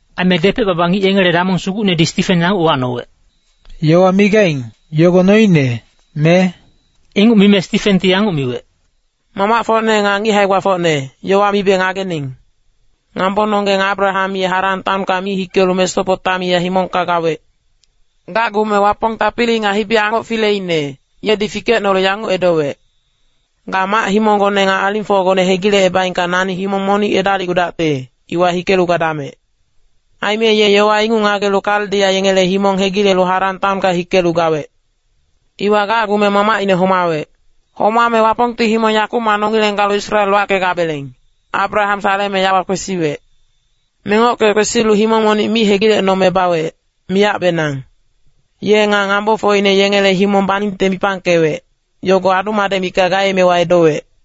Aime depec-baba ngic yengele damong sugucnedi Stifen yanguc uwacnowec, “Yowa migaing, yogo noine, me?” Inguc mime Stifenti yanguc miwec, “Mamacfocne nga ngic hae-gbafocne, yowa mibe ngagening. Ngambononggeng Abraham ye Haran taonka mi hikelu Mesopotamia himongka gawec. Gacgume Wapong tapili nga hibi-angoc fileine, yedi fikecnolu yanguc edowec. ‘Ga mac-himonggone nga alingfocgone hegilecebaengka nani himong monic edalicgudacte, iwa hikelu gadamec.’ “Aime ye yowa inguc ngagelu Kaldia yengele himong hegilelu Haran taonka hikelu gawec. Iwa gacgume mamacine homawec. Homame Wapongti himong yakumac nongileng galu Israel wackegabeleng, Abraham saleme yawa kwesiwec. Mengocke kwesilu himong monic mi hegilecnome bawec, miyacbenang. Ye nga ngambofocine yengele himong baningte mipangkewec, yogo adu-madec mikac gaemewa edowec.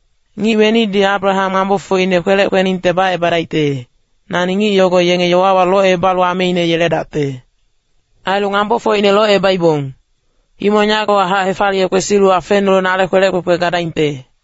Ngic wenidi Abraham ngambofocine kwelec kweningte bacebadaingte, nani ngic yogo yenge yowawa locebalu ameine yeledacte. Ailu ngambofocine locebaibong, himong yagowahac hefaliye kwesilu afenulu nale kwelec kwekwe gadaingte.’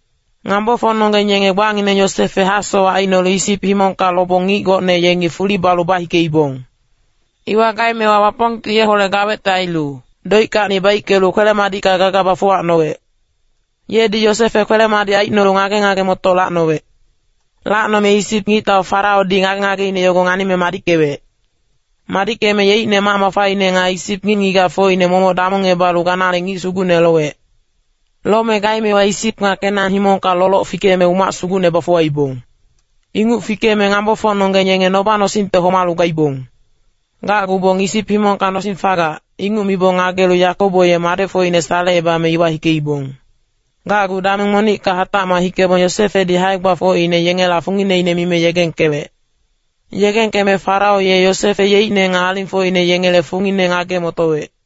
“Ngambofocnonggeng yenge gbangineng Yosefe hasowac aicnolu Isip himongka lobong ngic gocne yengi fuli balu bahikeibong. Iwa gaemewa Wapongti yeholec gawecte ailu doickacni baickelu kwele-madicka gaga bafuwacnowec. Yedi Yosefe kwele-madic aicnolu ngage-ngage-motoc lacnowec. Lacnome Isip ngictau Faraodi ngage-ngageine yogo nganime madickewec. Madickeme yeicne mac mafaine nga Isip ngic-ngigacfocine momoc damongebalu ganale ngic sugucne lowec. “Lome gaemewa Isip nga Kenan himongka loloc fikeme umac sugucne bafuwaibong. Inguc fikeme ngambofocnonggeng yenge noba-nosingte homalu gaibong. Gacgubong Isip himongka nosing fagac, inguc mibong ngagelu Yakobo ye madecfocine salecebame iwa hikeibong. Gacgu dameng monicka hatacmac hikebong Yosefedi hae-gbafocine yengela fungineine mime yegengkewec. Yegengkeme Farao ye Yosefe yeicne nga alingfocine yengele fungine ngage-motowec.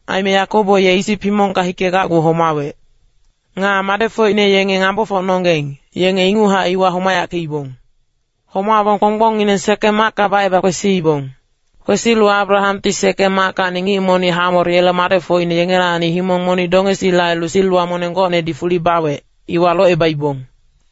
Aime Yakobo ye Isip himongka hikegacgu homawec. Nga madecfocine yenge ngambofocnonggeng, yenge inguchac iwa homayackeibong. Homabong kponggbongngineng Sekem macka baceba kwesiibong. Kwesilu Abrahamti Sekem mackacni ngic monic Hamor yele madecfocine yengelacni himong monic dongesile ailu siliwa moneng gocnedi fuli bawec, iwa locebaibong.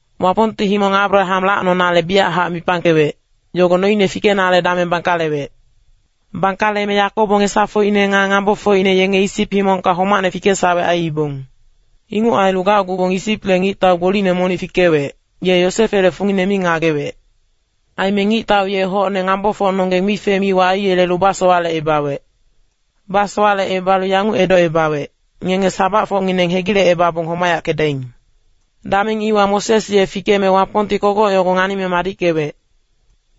“Wapongti himong Abraham lacnonale biyachac mipangkewec, yogo noine fikenale dameng bangkalewec. Bangkaleme Yakobo ngesafocine nga ngambofocine yenge Isip himongka homacne fikesawec aiibong. Inguc ailu gacgubong Isiple ngictau gbolicne monic fikewec, ye Yosefele fungine mi ngagewec. Aime ngictau ye hocne ngambofocnonggeng mife-miwa aiyelelu basowalecebawec. Basowalecebalu yanguc edocebawec, ‘Ngenge sabacfocngineng hegilecebabong homayackedaing.’ “Dameng iwa Moses ye fikeme Wapongti kogoc yogo nganime madickewec.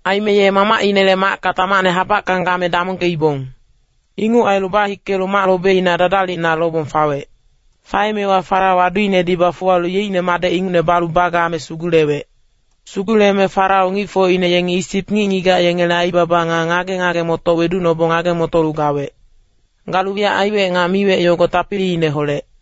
Aime ye mamacinele macka tamacne habackang game damongkeibong. Inguc ailu bahikelu mac lobeina dadalicna lobong fawec. Faemewa Farao aduinedi bafuwalu yeicne madec ingucne balu bagame sugulewec. Suguleme Farao ngicfocine yengi Isip ngic-ngigac yengele aibaba nga ngage-ngage-motoc weducnobong ngage-motolu gawec. Galu wiyac aiwec nga miwec yogo tapiliineholec.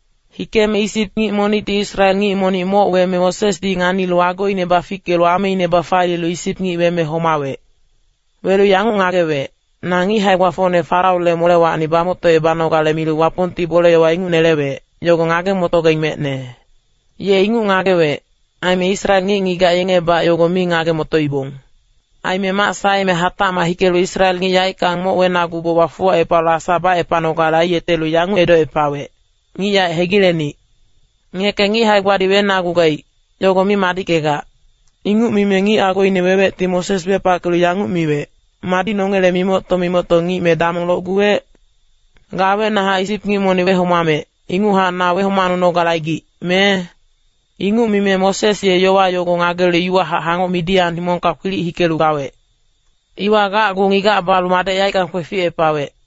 Hikeme Isip ngic monicti Israel ngic monic moc weme Mosesdi nganilu agoine bafickelu ameine bafaliyelu Isip ngic weme homawec. Welu yanguc ngagewec, ‘Na ngic hae-gbafocne Faraole molewacni bamoctocebanogale milu Wapongti bole inguc nelewec, yogo ngage-motogaing mecne.’ Ye inguc ngagewec, aime Israel ngic-ngigac yengebac yogo mi ngage-motoibong. Aime mac saeme hatacmac hikelu Israel ngic yaeckang moc wenaguboc bafuwacepalu asa bacepanogale aiyetelu yanguc edocepawec, ‘Ngic yaec hegilenic. Ngeke ngic hae-gbadi wenagugaic, yogo mi madickegac.’ “Inguc mime ngic agoine wewecti Moses wepackelu yanguc miwec, ‘Madi nongele mimocto-mimocto ngic me damong locguwec? Ga awecnahac Isip ngic monic wehomamec, inguchac na wehomacnunogale aigic, me?’ Inguc mime Moses ye yowa yogo ngagelu iwahac hangoc Midian himongka kwilic hikelu gawec. Iwa gacgu ngigac balu madec yaeckang kweficepawec.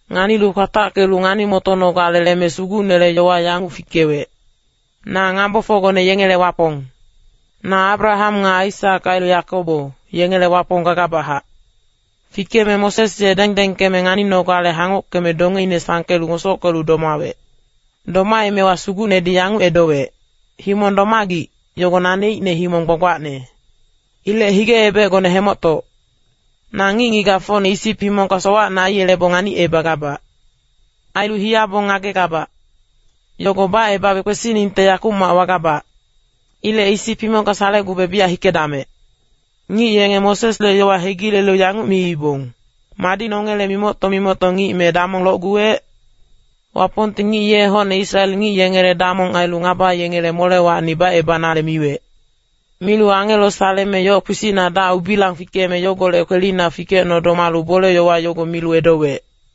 Nganilu kwatackelu ngani-motonogale leme Sugucnele yowa yanguc fikewec, ‘Na ngambofocgone yengele Wapong. Na Abraham nga Aisak ailu Yakobo, yengele Wapong gagabachac.’ Fikeme Moses ye dengdengkeme nganinogale hangockeme dongeine sangkelu ngosockelu domawec. “Domaemewa Sugucnedi yanguc edowec, ‘Himong domagic, yogo naneicne himong gbagbacne. Ilec hige-ebecgone hemoctoc. Na ngic-ngigacfocne Isip himongka sowacne aiyelebong nganicebagabac. Ailu hiyabong ngagegabac. Yogo bacebabe kwesiningte yakumac wagabac. Ilec Isip himongka salecgube biyac hikedamec.’ “Ngic yenge Mosesle yowa hegilelu yanguc miibong, ‘Madi nongele mimocto-mimocto ngic me damong locguwec?’ Wapongti ngic ye hocne Israel ngic yengele damong ailu ngaba yengele molewacni bacebanale miwec. Milu angelo saleme yoc kpisicna dac-ubilang fikeme yogolec kwelina fikecno domalu bole-yowa yogo milu edowec.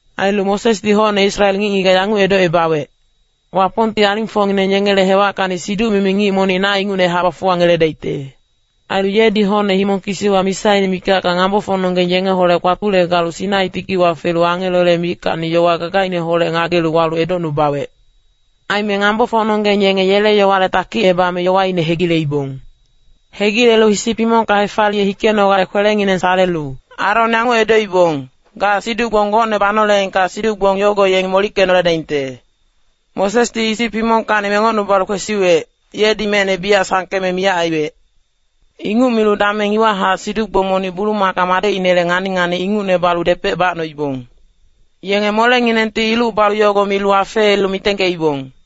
“Ailu Mosesdi hocne Israel ngic-ngigac yanguc edocebawec, ‘Wapongti alingfocngineng yengele hewackacni siduc-mimi ngic monic na ingucnehac bafuwangeledaicte.’ Ailu yedi hocne himong kisiwa misaine mikacka ngambofocnonggeng yengeholec kpatule galu Sinai tikiwa felu angelole mickacni yowa gagaineholec ngagelu walu edocnubawec. “Aime ngambofocnonggeng yenge yele yowale takicebame yowaine hegileibong. Hegilelu Isip himongka hefaliye hikenogale kwelengineng salelu Aron yanguc edoibong, ‘Ga siduc-gbong gocne banoleengka siduc-gbong yogo yengi molickenoledaingte. Mosesdi Isip himongkacni mengocnubalu kwesiwec, yedi mecne biyac sangkeme miyac aiwec.’ Inguc milu dameng iwahac siduc-gbong monic bulumaka madecinele ngani-ngani ingucne balu depec bacnoibong. Yenge molenginengti iluc balu yogo milu afeelu mitengkeibong.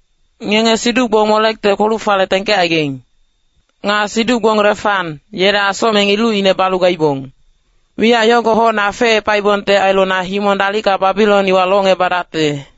Ngenge siduc-gbong Molekte kpoluc-fale tengkecaigaing. Nga siduc-gbong Refan, yele asocmeng ilucine balu gaibong. Wiyac yogo hocne afeepaibongte ailu na himong dalicka Babilon iwa locngebadacte.’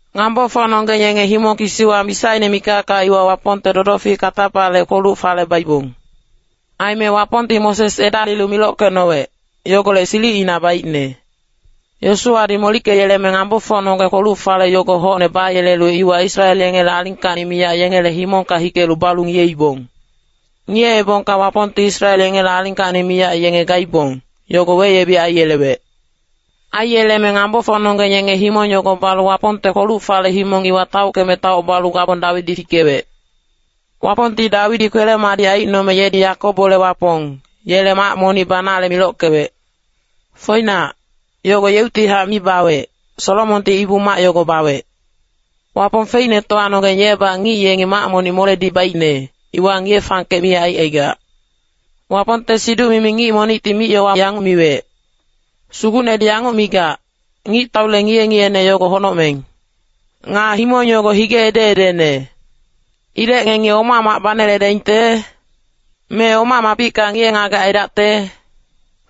“Ngambofocnonggeng yenge himong kisiwa misaine mikacka iwa Wapongte dodofic katapale kpoluc-fale baibong. Aime Wapongti Moses edalilu milockecnowec, yogolec silicina baicne. Yosuwadi molickeyeleme ngambofocnonggeng kpoluc-fale yogo hocne bayelelu iwa Israel yengele alingkacni miyac yengele himongka hikelu balu ngiyeibong. Ngiyeebongka Wapongti Israel yengele alingkacni miyac yenge gaibong, yogo weyebic aiyelewec. Aiyeleme ngambofocnonggeng yenge himong yogo balu Wapongte kpoluc-fale himong iwa taockeme taoc balu gabong Dawidi fikewec. Wapongti Dawidi kwele-madic aicnome yedi Yakobole Wapong, yele mac monic banale milockewec. Foinac, yogo yeuctihac mi bawec, Solomonti Ibu-mac yogo bawec. Wapong Feicnetowanonggeng yebac ngic yengi mac monic moledi baicne, iwa ngiye-fangkec mi aicaigac. Wapongte siduc-mimi ngic monicti mic-yowa yanguc miwec, ‘Sugucnedi yanguc migac, “Ngictaule ngiye-ngiyene yogo honocmeng. Nga himong yogo hige ede-edene. Ilec ngengi oma mac baneledaingte? Me oma mapicka ngiye-ngagec aidacte?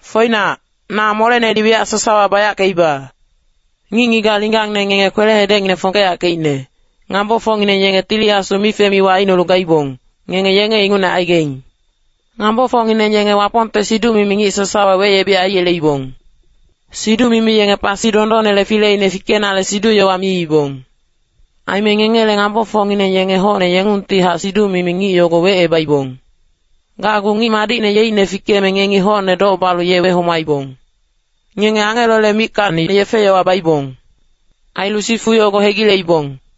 Foinac, na molenedi wiyac sasawa bayackeiba.” ’ “Ngic-ngigac linggangne ngenge kwele-hedecngineng fongkeyackeicne, ngambofocngineng yenge Tili Asu mife-miwa aicnolu gaibong, ngenge yenge ingucne aigaing. Ngambofocngineng yenge Wapongte siduc-mimi ngic sasawa weyebic aiyeleibong. Siduc-mimi yenge pasi dondonnele fileine fikenale siduc-yowa miibong. Aime ngengele ngambofocngineng yenge hocne yengungtihac siduc-mimi ngic yogo wecebaibong. Gacgu Ngic Madicne yeicne fikeme ngengi hocne doc balu ye wehomaibong. Ngenge angelole mickacni yefe-yowa baibong. Ailu sifu yogo hegileibong.”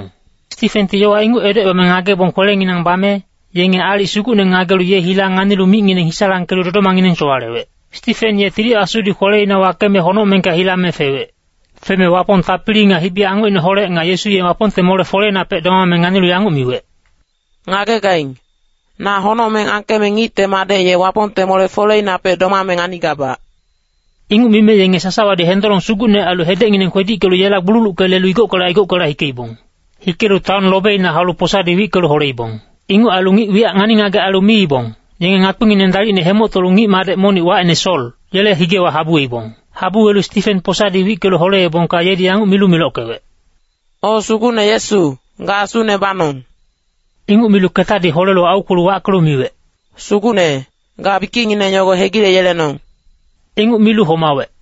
Stifenti yowa inguc edocebame ngagebong kwelenginang bame, yenge aalic sugucne ngagelu ye hila nganilu micngineng hisalangkelu dodomangineng sowalewec. Stifen ye Tili Asudi kweleina wakeme honocmengka hilame fewec. Feme Wapong tapili nga hibi-angocineholec nga Yesu ye Wapongte mole-foleinapec domame nganilu yanguc miwec, “Ngagegaing, na honocmeng angkeme Ngicte Madec ye Wapongte mole-folewapec domame nganigabac.” Inguc mime yenge sasawadi hendolong sugucne ailu hedecngineng kwedickelu yela gbululucke lelu igockela igockela hikeibong. Hikelu taon lobeina haulu posadi wickelu holeibong. Inguc ailu ngic wiyac ngani-ngagec ailu miibong, yenge ngakpingineng dalicne hemoctolu ngic-madec monic wacine Sol, yele higewa habuweibong. Habuwelu Stifen posadi wickelu holeebongka yedi yanguc milu milockewec, “O Sugucne Yesu, ga asune banong.” Inguc milu ketadi holelu aukwelu wackelu miwec, “Sugucne, ga bikicngineng yogo hegileyelenong.” Inguc milu homawec.